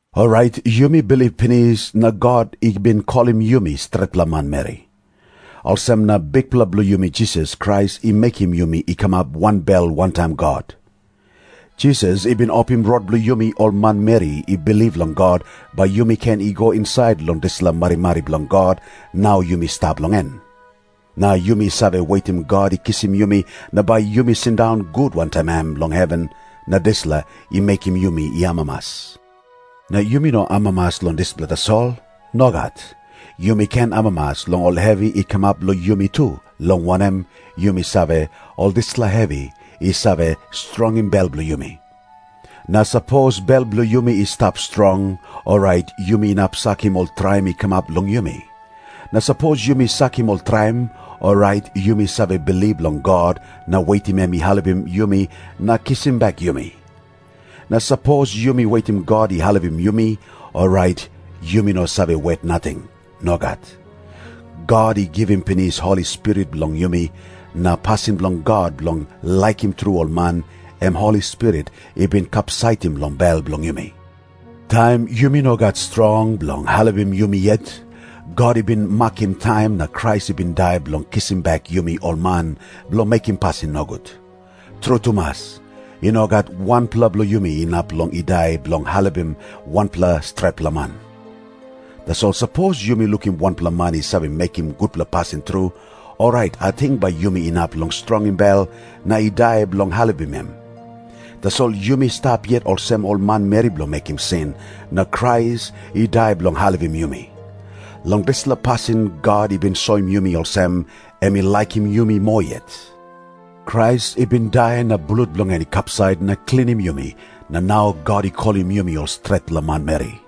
Orait yumi bilip pinis na God i bin kolim yumi stretpela manmeri. Olsem na Bikpela bilong yumi Jisas Krais i mekim yumi i kamap wanbel wantaim God. Jisas i bin opim rot bilong yumi ol manmeri i bilip long God, bai yumi ken i go insait long dispela marimari bilong God, nau yumi stap long en. Na yumi save wetim God i kisim yumi na bai yumi sindaun gut wantaim em long heven, na dispela i mekim yumi i amamas. Na yumi no amamas long dispela tasol. Nogat. Yumi ken amamas long ol hevi i kamap long yumi tu, long wanem, yumi save, ol dispela hevi i save strongim bel bilong yumi. Na sapos bel bilong yumi i stap strong, orait yumi inap sakim ol traim i kamap long yumi. Na sapos yumi sakim ol traim, orait yumi save bilip long God na wetim em i helpim yumi na kisim bek yumi. Na sapos yumi wetim God i helpim yumi, orait yumi no save wet nating. Nogat. God i givim pinis Holi Spirit long yumi, na pasin bilong God bilong laikim tru ol man, em Holi Spirit i bin kapsaitim long bel bilong yumi. Taim yumi no gat strong bilong helpim yumi yet, God i bin makim taim na Krais i bin dai bilong kisim bek yumi ol man bilong mekim pasin nogut. Tru tumas, i no gat wanpela bilong yumi inap long i dai bilong helpim wanpela stretpela man. Tasol sapos yumi lukim wanpela man i save mekim gutpela pasin tru, orait ating bai yumi inap long strongim bel na i dai bilong helpim em. Tasol yumi stap yet olsem ol manmeri bilong mekim sin, na Krais i dai bilong helpim yumi. Long dispela pasin God i bin soim yumi olsem, em i laikim yumi moa yet. Krais i bin dai na blut bilong en i kapsait na klinim yumi, na nau God i kolim yumi ol stretpela manmeri.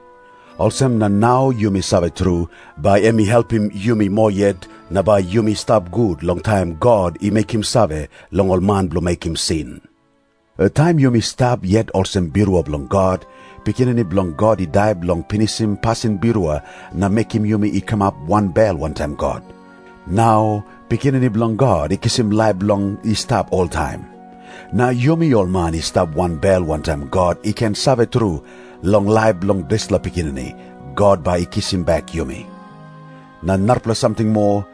Olsem na nau yumi save tru, bai em i helpim yumi moa yet, na bai yumi stap gut long taim God i mekim save long ol man bilong mekim sin. Taim yumi stap yet olsem birua bilong God, Pikinini Bilong God i dai bilong pinisim pasin birua na mekim yumi i kamap wanbel wantaim God. Nau Pikinini Bilong God i kisim laip bilong i stap oltaim. Na yumi ol man i stap wanbel wantaim God i ken save tru, long laip bilong dispela Pikinini, God bai i kisim bek yumi. Na narapela samting moa.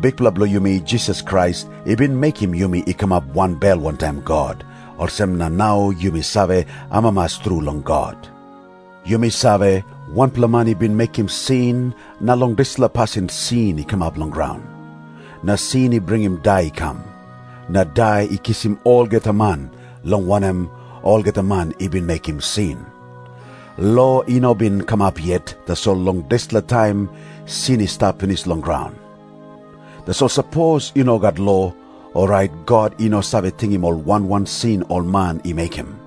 Bikpela bilong yumi, Jisas Krais, i bin mekim yumi i kamap wanbel wantaim God, olsem na nau yumi save amamas tru long God. Yumi save, wanpela man i bin mekim sin, na long dispela pasin sin i kamap long graun. Na sin i bringim dai i kam. Na dai i kisim olgeta man, long wanem, olgeta man i bin mekim sin. Lo i no bin kamap yet, tasol long dispela taim sin i stap pinis long graun. Tasol sapos i no gat lo, orait God i no save tingim ol wan wan sin ol man i mekim.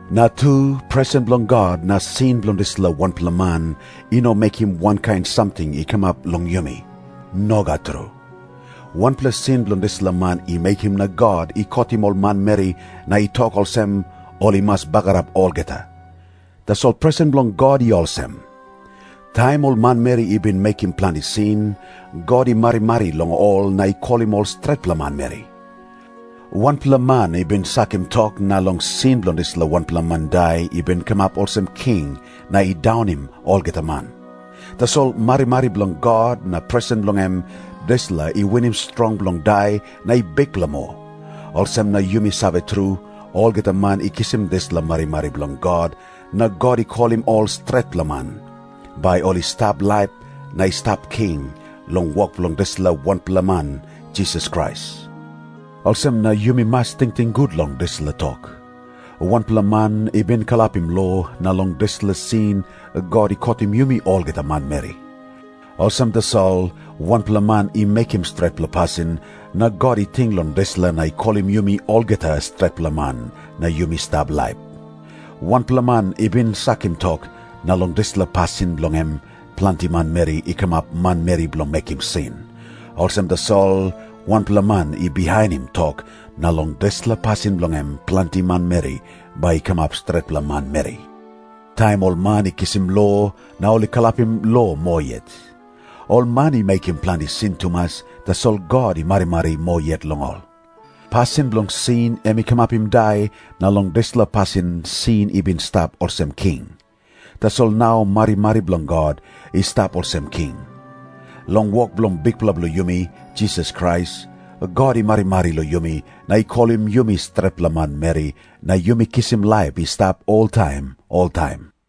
Na tu, presen bilong God na sin bilong dispela wanpela man i no mekim wankain samting i kamap long yumi. Nogat tru. Wanpela sin bilong dispela man i mekim na God i kotim ol manmeri na i tok olsem, “Ol i mas bagarap olgeta.” Tasol presen bilong God i olsem. Taim ol manmeri i bin mekim planti sin, God i marimari long ol na i kolim ol stretpela manmeri. Wanpela man i bin sakim tok, na long sin bilong dispela wanpela man dai i bin kamap olsem king na i daunim olgeta man. Tasol marimari bilong God na presen bilong em, dispela i winim strong bilong dai na i bikpela moa. Olsem na yumi save tru, olgeta man i kisim dispela marimari bilong God na God i kolim ol stretpela man, bai ol i stap laip na i stap king, long wok bilong dispela wanpela man Jisas Krais. Olsem na yumi mas tingting gut long dispela tok. Wanpela man i bin kalapim lo, na long dispela sin God i kotim yumi olgeta manmeri. Olsem tasol, wanpela man i mekim stretpela pasin, na God i ting long dispela na i kolim yumi olgeta stretpela man, na yumi stap laip. Wanpela man i bin sakim tok, na long dispela pasin bilong em ol manmeri i kamap manmeri bilong mekim sin. Olsem tasol, wanpela man i bihainim tok, na long dispela pasin bilong em ol arapela manmeri bai i kamap stretpela manmeri. Taim ol man i kisim lo, na ol i kalapim lo moa yet. Ol man i mekim planti sin tumas, tasol God i marimari moa yet long ol. Pasin bilong sin em i kamapim dai, na long dispela pasin sin i bin i stap olsem king. Tasol nau marimari bilong God i stap olsem king. Long wok bilong Bikpela bilong yumi, Jisas Krais, God i marimari long yumi na i kolim yumi stretpela manmeri na yumi kisim laip i stap oltaim oltaim.